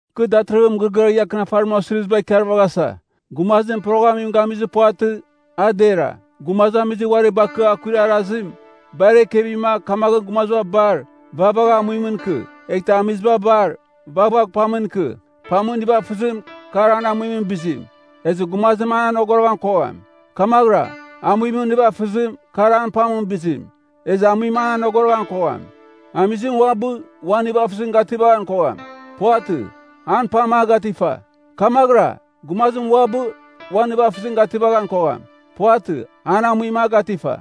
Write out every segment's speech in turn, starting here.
Kɨ datɨrɨghɨn mɨgɨrɨgɨar ia akɨnafarimɨn osiriziba ikarvaghasa. Gumazim poroghamim gamizir puvatɨ, a dera. Gumazamizir uari bakɨa akuir arazim, bar ekevima, kamaghɨn gumaziba bar, vaghvagh amuimɨn ikɨ, eghtɨ amiziba bar, vaghvagh pamɨn ikɨ. Pamɨn nivafɨzim, kar an amuimɨn bizim, ezɨ gumazim an anogoroghan kogham. Kamaghɨra, amuimɨn nivafɨzim, kar an pamɨn bizim, ezɨ amuim an anogoroghan kogham. Amizim uabɨ, uan nivafɨzim gativan kogham. Puvatɨ, an pam a gatifa. Kamaghɨra, gumazim uabɨ, uan nivafɨzim gativan kogham. Puvatɨ, an amuim a gatifa.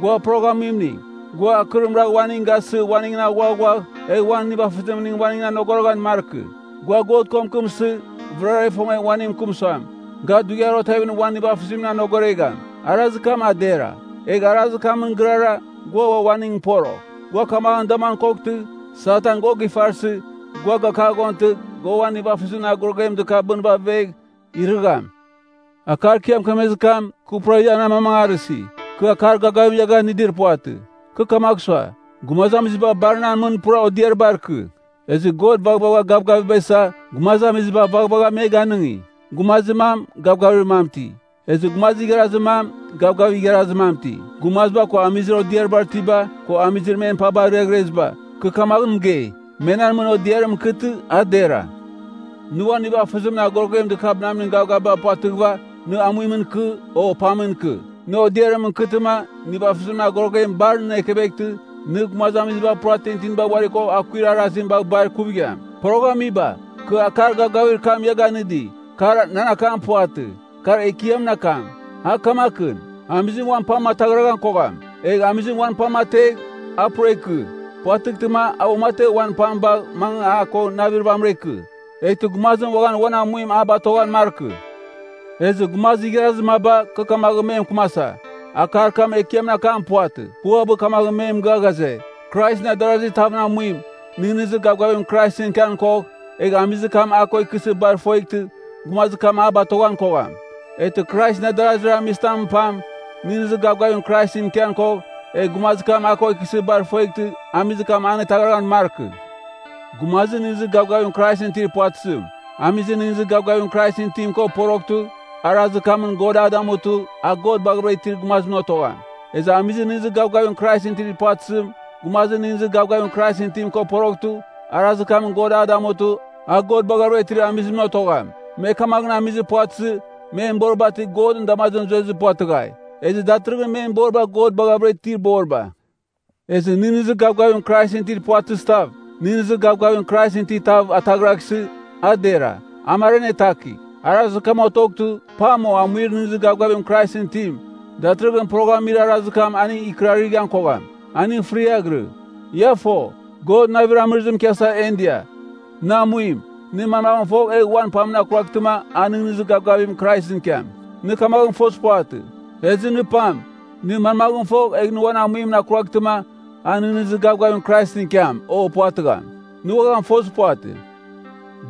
Gua poroghamning, gua akɨrim ragh uaning gasɨ uaningɨn aghuaghuagh, egh uan nivafɨzimning uaningɨn anogoroghan markɨ. Gua God ko mɨkɨmsɨ, vɨrara ifongegh uaning mɨkɨm suam, ga dughiar otevimɨn uan nivafɨzimning anogoregham, arazir kam dera. Egh arazir kamɨn gɨrara, gua ua uaningɨn porogh. Gua kamaghɨn damuan koghtɨ, Satan gua gifarsɨ, gua gakaghontɨ, gua uan nivafɨzimɨn agoroguem dɨkabɨnɨva avegh, irɨgham. Akar kɨ ia mɨkemezir kam, kɨ pura ian amamangarɨsi. Kɨ akar gavgavim ia ganɨdir puvatɨ. Kɨ kamagh sua, gumazamiziba bar nan mɨn pura odiaribar ikɨ. Ezɨ God vaghvagha gavgavim isa, gumazamiziba vaghvagha me ganɨngi. Gumazir mam, gavgavir mam iti, ezɨ gumazir igharazir mam, gavgavir igharazir mam iti. Gumaziba ko amizir odiarbar itiba, ko amizir men paba arɨghɨreziba, kɨ kamaghɨn mɨgei, me nan mɨn odiarimɨn ikɨtɨ, a dera. Nɨ uan nivafɨzimɨn agorogem dɨkabɨnamin gavgavim puvatɨghɨva, nɨ amuimɨn ikɨ, o pamɨn ikɨ. Nɨ odiarimɨn ikɨtɨma, nivafɨzir agoroguem bar nɨn ekeveghtɨ, nɨ gumazamiziba pura tintinibar uari ko akuir arazim bagh bar ikuvigham. Poroghamiba, kɨ akar gavgavir kam ia ganɨdi, kar nan akam puvatɨ, kar Ekiamɨn akam. A kamakɨn: Amizim uan pam ataghraghan kogham. Egh amizim uan pam ategh, a pura ikɨ. Puvatɨghtɨma, a uamategh uan pam bagh mangɨva a ko navir vamɨra ikɨ. Eghtɨ gumazim uaghan uan amuim a batoghan markɨ. Ezɨ, gumazir igharazir maba, kɨ kamaghɨn me mɨkɨmasa, akar kam Ekiamɨn akam puvatɨ. Kɨ uabɨ kamaghɨn me mɨgɨa ghaze, Kraisɨn adarazir tavɨn amuim, nɨghnɨzir gavgavim Kraisɨn ikian kogh, egh amizir kam a ko ikɨsɨ bar ifongeghtɨ, gumazir kam a batoghan kogham. Eghtɨ Kraisɨn adarazir amizitamɨn pam, nɨghnɨzir gavgavim Kraisɨn ikian kogh, egh gumazir kam a ko ikɨsɨ bar ifongeghtɨ, amizir kam anetaghɨraghan markɨ. Gumazir nɨghnɨzir gavgavim Kraisɨn itir puvatɨzim, amizir nɨghnɨzir gavgavim Kraisɨn itim ko poroghtɨ, arazir kamɨn God a damutɨ, a God baghavɨra itir gumazimɨn otogham. Ezɨ amizir nɨghnɨzir gavgavim Kraisɨn itir puvatɨzim, gumazir nɨghnɨzir gavgavim Kraisɨn itim ko poroghtɨ, arazir kamɨn God a damutɨ, a God baghavɨra itir amizimɨn otogham. Me kamaghɨn amizir puvatɨzɨ, men boriba ti Godɨn damazimɨn zuezir puvatɨghai. Ezɨ datɨrɨghɨn men boriba God baghavɨra itir boriba. Ezɨ nɨghnɨzir gavgavim Kraisɨn itir puvatɨzitav, nɨghnɨzir gavgavim Kraisɨn itir tav ataghraghsɨ, a dera. A mar anetakigh. Arazir kam otoghtɨ, pam o amuir nɨghnɨzir gavgavim Kraisɨn itim, datɨrɨghɨn poroghamir arazir kam aning ikɨrarɨghan kogham. Aning fɨriaghɨrɨ. Ia fo, God navir amɨrɨzimɨn ikiasa en dia. Nɨ amuim, nɨ manmaghɨn fogh, egh uan pamɨn akuraghtɨma, a nɨghnɨzir gavgavim Kraisɨn ikiam? Nɨ kamaghɨn fozir puvatɨ. Ezɨ nɨ pam, nɨ manmaghɨn fogh, egh nɨ uan amuimɨn akuraghtɨma, a nɨghnɨzir gavgavim Kraisɨn ikiam, o puvatɨgham? Nɨ uaghan fozir puvatɨ.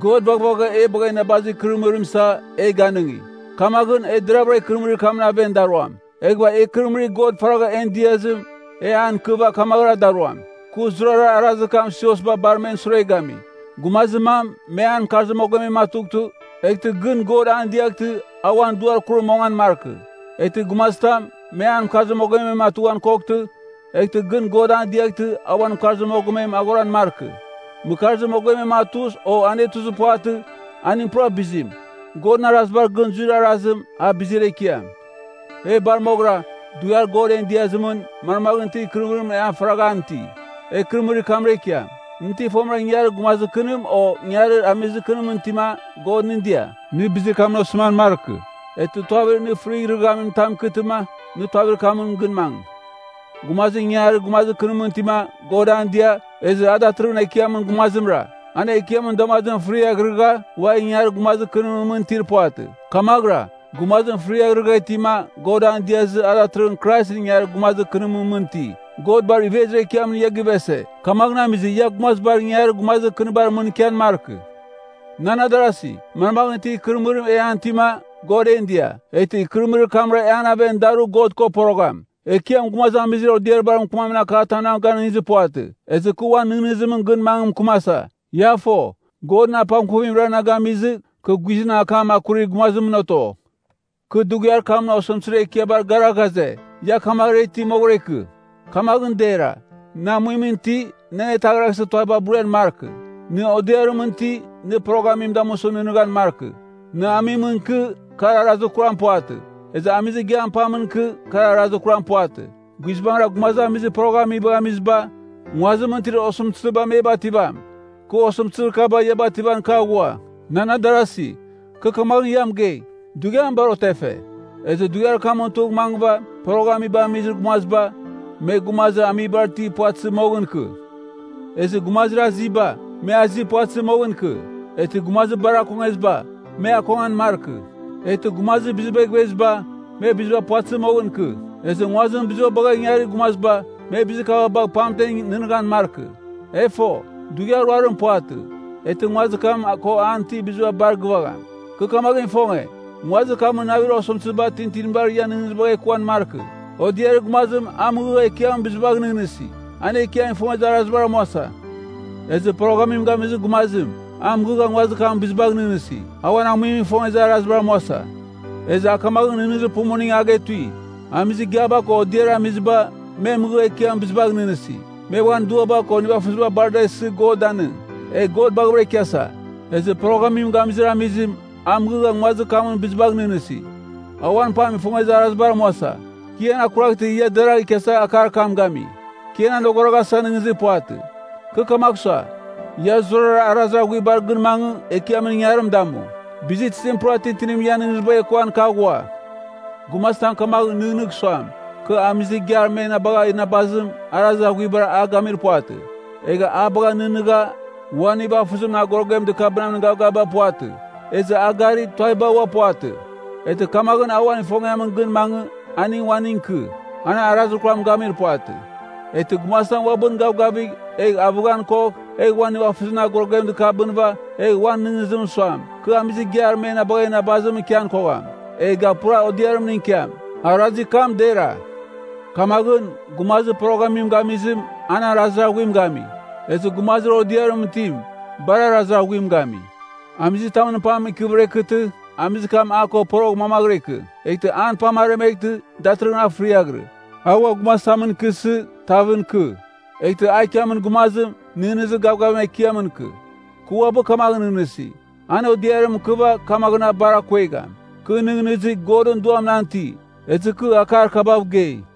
God vaghvagha e bagha inabazir ikɨrɨmɨrim isa, e ganɨngi. Kamaghɨn, e deravɨra ikɨrɨmɨrir kamɨn aven daruam. Eghɨva e ikɨrɨmɨrir God faragha en diazim, e an ikɨva kamaghɨra daruam. Kɨ zurara arazir kam siosba bar men sure gami. Gumazir mam, me an mɨkarzir mogomem atughtɨ, eghtɨ gɨn God an diaghtɨ, a uan duar kurim mongan markɨ. Eghtɨ gumazitam, me an mɨkarzir mogomem atughan koghtɨ, eghtɨ gɨn God an diaghtɨ, a uan mɨkarzir mogomem aghoran markɨ. Mɨkarzir mogomem atuz, o anetuzir puvatɨ, aning pura bizim. Godɨn arazibar gɨn zuir arazim, a bizir ekiam. E bar moghɨra, dughiar God en diazimɨn, manmaghɨn itir ikɨrɨmɨrim e faragha an iti, e ikɨrɨmɨrir kamra ikiam. Nɨ ti fomɨra ingangarir gumazir kɨnim o ingangarir amizir kɨnimɨn itima, God nɨn dia? Nɨ bizir kamɨn osɨman markɨ. Eghtɨ tuavir nɨ fɨrighrɨghamin tam ikɨtɨma, nɨ tuavir kamɨn gɨn mangɨ. Gumazim ingangarir gumazir kɨnimɨn itima, God an dia, ezɨ a datɨrɨghɨn Ekiamɨn gumazimra. An Ekiamɨn damazimɨn fɨriaghrɨgha, ua ingangarir gumazir kɨnimɨn mɨn itir puvatɨ. Kamaghɨra, gumazim fɨriaghrɨgha itima, God an diazɨ, a datɨrɨghɨn Kraisɨn ingangarir gumazir kɨnimɨn mɨn iti. God bar ivezir ekiamɨn ia givese, kamaghɨn amizɨ ia gumazibar ingangarir gumazir kɨnibar mɨn ikian markɨ. Nan adarasi, manmaghɨn itir ikɨrɨmɨrim e an itima, God en dia, eghtɨ ikɨrɨmɨrir kamra e an aven daru God ko porogham. Ekiam gumazamizir odiaribar mɨkɨmamin akatam na ganɨngizir puvatɨ. Ezɨ kɨ uan nɨghnɨzimɨn gɨn mangɨ mɨkɨmasa. Ia fo, Godɨn apangkuvimra na gamizɨ, kɨ guizɨn akam akurir gumazimɨn oto. Kɨ dughiar kamɨn osɨmtɨzir ekiabar gara ghaze, ia kamaghɨra iti moghɨra ikɨ, kamaghɨn dera. Nɨ amuimɨn iti, nɨ anetaghraghsɨ tuaviba burian markɨ. Nɨ odiarimɨn iti, nɨ poroghamim damusɨ nɨghnɨghan markɨ. Nɨ amimɨn ikɨ, kar arazir kuram puvatɨ. Ezɨ amizir igiam pamɨn ikɨ, kar arazir kuram puvatɨ. Guizbangɨra gumazamizir poroghamibagh amiziba, nguazimɨn itir osɨmtɨziba me bativam. Kɨ osɨmtɨzir kaba, ia bativan kɨ aghua. Nan adarasi, kɨ kamaghɨn ia mɨgei, dughiam bar otefe. Ezɨ dughiar kamɨn tugh mangɨva, poroghamibagh amizir gumaziba, me gumazir amibar itir puvatɨzɨ moghɨn ikɨ. Ezɨ gumazir aziba, me azi puvatɨzɨ moghɨn ikɨ. Eghtɨ gumazir bar akongeziba, me akongan markɨ. Eghtɨ gumazir bizibagh iveziba, me biziba puvatɨzɨ moghɨn ikɨ. Ezɨ nguazimɨn biziba bagha ingarir gumaziba, me bizir kaba bagh pamtem nɨghnɨghan markɨ. E fo, dughiar ruarim puvatɨ, eghtɨ nguazir kam ko an itir biziba bar gɨvagham. Kɨ kamaghɨn ifonge, nguazir kamɨn navir osɨmtɨziba tintinibar ian nɨghnɨzibagh ekuan markɨ. Odiarir gumazim, a mɨghɨgha Ekiamɨn bizibagh nɨghnɨsi. An Ekiam ifongezir arazibar amuasa. Ezɨ poroghamim gamizir gumazim, a mɨghɨgha nguazir kamɨn bizibagh nɨghnɨsi. A uan amuim ifongezir arazibar amuasa. Ezɨ a kamaghɨn nɨghnɨzir pumuning a getui. Amizir igiaba ko odiarir amiziba, me mɨghɨgha Ekiamɨn bizibagh nɨghnɨsi. Me uan duaba ko nivafɨziba bar da isɨ God danɨng, egh God baghɨvɨra ikiasa. Ezɨ poroghamim gamizir amizim, a mɨghɨgha nguazir kamɨn bizibagh nɨghnɨsi. A uan pam ifongezir arazibar amuasa. Kɨ ian akuraghtɨ ia deragh ikiasa akar kam gami. Kɨ ian anogoroghasa nɨghnɨzir puvatɨ. Kɨ kamagh sua, ia zurara arazir aghuibar gɨn mangɨ, Ekiamɨn ingangarim damu. Bizitizim pura tintinimɨn ian nɨghnɨzibagh ekuan kɨ aghua. Gumazitam kamaghɨn nɨghnɨgh suam, kɨ amizir igiar me na bagha inabazim, arazir aghuiba a gamir puvatɨ. Egha a bagha nɨghnɨgha, uan nivafɨzimɨn agoroguem dɨkabɨnamin gavgavim puvatɨ. Ezɨ a gari, tuaviba ua puvatɨ. Eghtɨ kamaghɨn a uan ifongiamɨn gɨn mangɨ, aning uaning ikɨ. An arazir kuram gamir puvatɨ. Eghtɨ gumazitam uabɨn gavgavigh, egh avɨghan kogh, egh uan nivafɨzimɨn agoroguem dɨkabɨnɨva, egh uan nɨghnɨzimɨn suam, kɨ amizir igiar me na bagha inabazimɨn ikian kogham, egh ga pura odiarimningɨn ikiam, arazir kam dera. Kamaghɨn, gumazir poroghamim gamizim, an arazir aghuim gami. Ezɨ gumazir odiarimɨn itim, bar arazir aghuim gami. Amizitamɨn pam ikɨvɨra ikɨtɨ, amizir kam a ko porogh mamaghɨra ikɨ. Eghtɨ an pam aremeghtɨ, datɨrɨghɨn a fɨriaghɨrɨ. A ua gumazitamɨn ikɨsɨ, tavɨn ikɨ. Eghtɨ a ikiamin gumazim, nɨghnɨzir gavgavim Ekiamɨn ikɨ. Kɨ uabɨ kamaghɨn nɨghnɨsi, an odiarimɨn ikɨva, kamaghɨn a bar akuegham. Kɨ nɨghnɨsi, Godɨn Duam nan iti, ezɨ kɨ akar kabav gei.